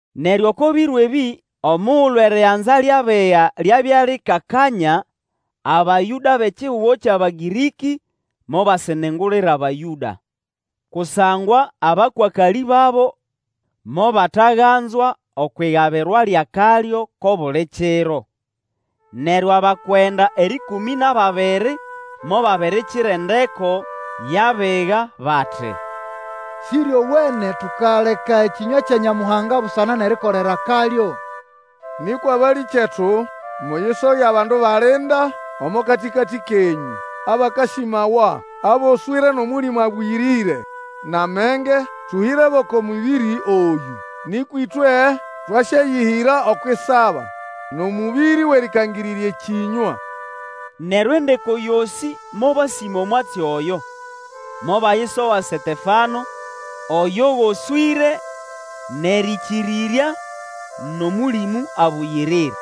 Neryo oko biro ebĩ, omugulu eriganza lyʼabiga lyabya likakanya, Abayũda bʼekihugo kyʼAbagĩrĩkĩ mobasĩnĩngũlĩra Bayũda, kusangwa abakwakalĩ babo mobataganzwa okwʼigabirwa lyʼakalyo kʼobuli kiro. Neryo abakwenda erĩkũmĩ nʼababiri, mobabirikira endeko yʼabiga bati, Sĩryowene tukaleka ekĩnywa kya Nyamuhanga busana nʼerikolera akalyo. Nĩkwa balĩkyetu, muyisoge abandu balinda omo katĩkatĩ kenyũ, abakasĩmawa, aboswĩre nʼOmũlĩmũ Abũyĩrĩre nʼamenge, tũhĩrebo oko mũbĩrĩ oyũ. Nĩkwa ĩtwe twasyayĩhĩra okwʼisaba, nʼomũbĩrĩ wʼerĩkangĩrĩrya ekĩnywa. Neryo endeko yosĩ mobasĩma omwatsi oyo, Mobayisoga Setefano oyo goswĩre nʼerĩkĩrĩrya nʼOmũlĩmũ Abũyĩrĩre,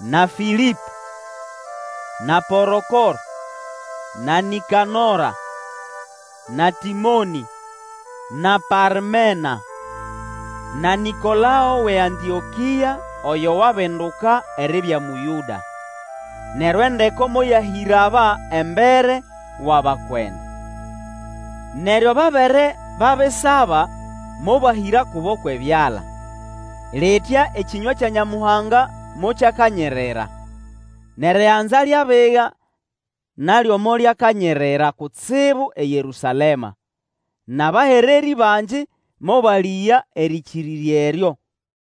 na Fĩlĩpo, na Porokoro, na Nĩkanora, na Tĩmonĩ, na Parmena, na Nĩkolao wʼeAntĩokĩa, oyo wabinduka eribya Mũyũda. Neryo endeko moyahĩra aba embere wʼabakwenda, neryo babere babisaba mobahĩra kubo kwʼebyala. Litya ekĩnywa kya Nyamuhanga mokyakanyirira. Nʼeriganza lyʼabiga nalyo molyakanyirira kutsibu eYerũsalema, nʼabahererĩ bangi mobalĩga erĩkĩrĩrya eryo.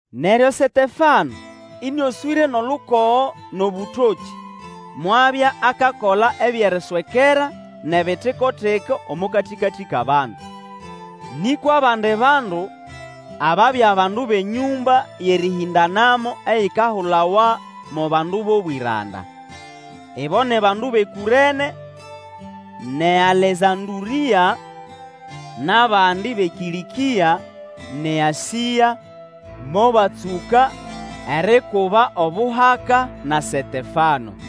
Neryo Setefano, ĩnĩoswĩre nʼolukogo nʼobũtokĩ, mwabya akakola ebyʼeriswekera nʼebitiko-tiko omo katĩkatĩ kʼabandu. Nĩkwa abandi bandu, ababya bandu bʼenyũmba yʼerĩhĩndanamo eyikahulawa mo Bandu bʼobwĩranda. Ibo ni bandu bʼeKũrene, nʼeAlesandũrĩa, nʼabandi bʼeKĩlĩkĩa nʼeAsĩa mobatsũka erikuba obuhaka na Setefano.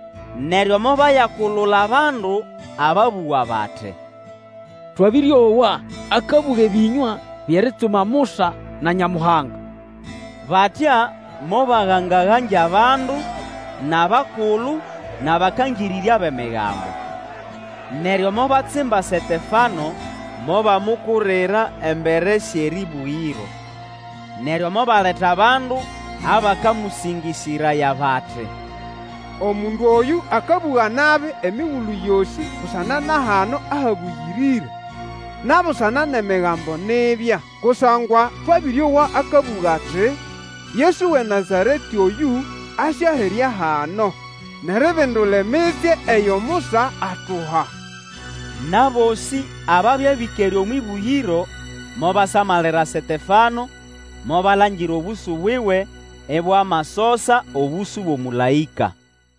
Neryo mobayakulula abandu ababũga bati, Twabĩrĩowa akabũga ebĩnywa byʼeritsuma Musa na Nyamuhanga. Batya mobagangagangya abandu, nʼabakulu, nʼabakangĩrĩrya bʼEmigambo. Neryo mobatsimba Setefano mobamukurira embere syʼerĩbũgĩro. Neryo mobaleta bandu abakamũsĩngĩsĩraya bati, Omundu oyũ akabũga nabi emigulu yosĩ busana na hano ahabũyĩrĩre, na busana nʼEmigambo nibya. Kusangwa twabĩrĩowa akabũga ati, Yesu wʼeNazaretĩ oyũ, asyaherya hano, nʼeribindula emitsye eyo Musa atuha! Nʼabosĩ ababya bĩkere omwʼĩbũgĩro, mobasamalira Setefano, mobalangira obũsũ buwe ibwamasosa obũsũ bwʼomũlaĩka.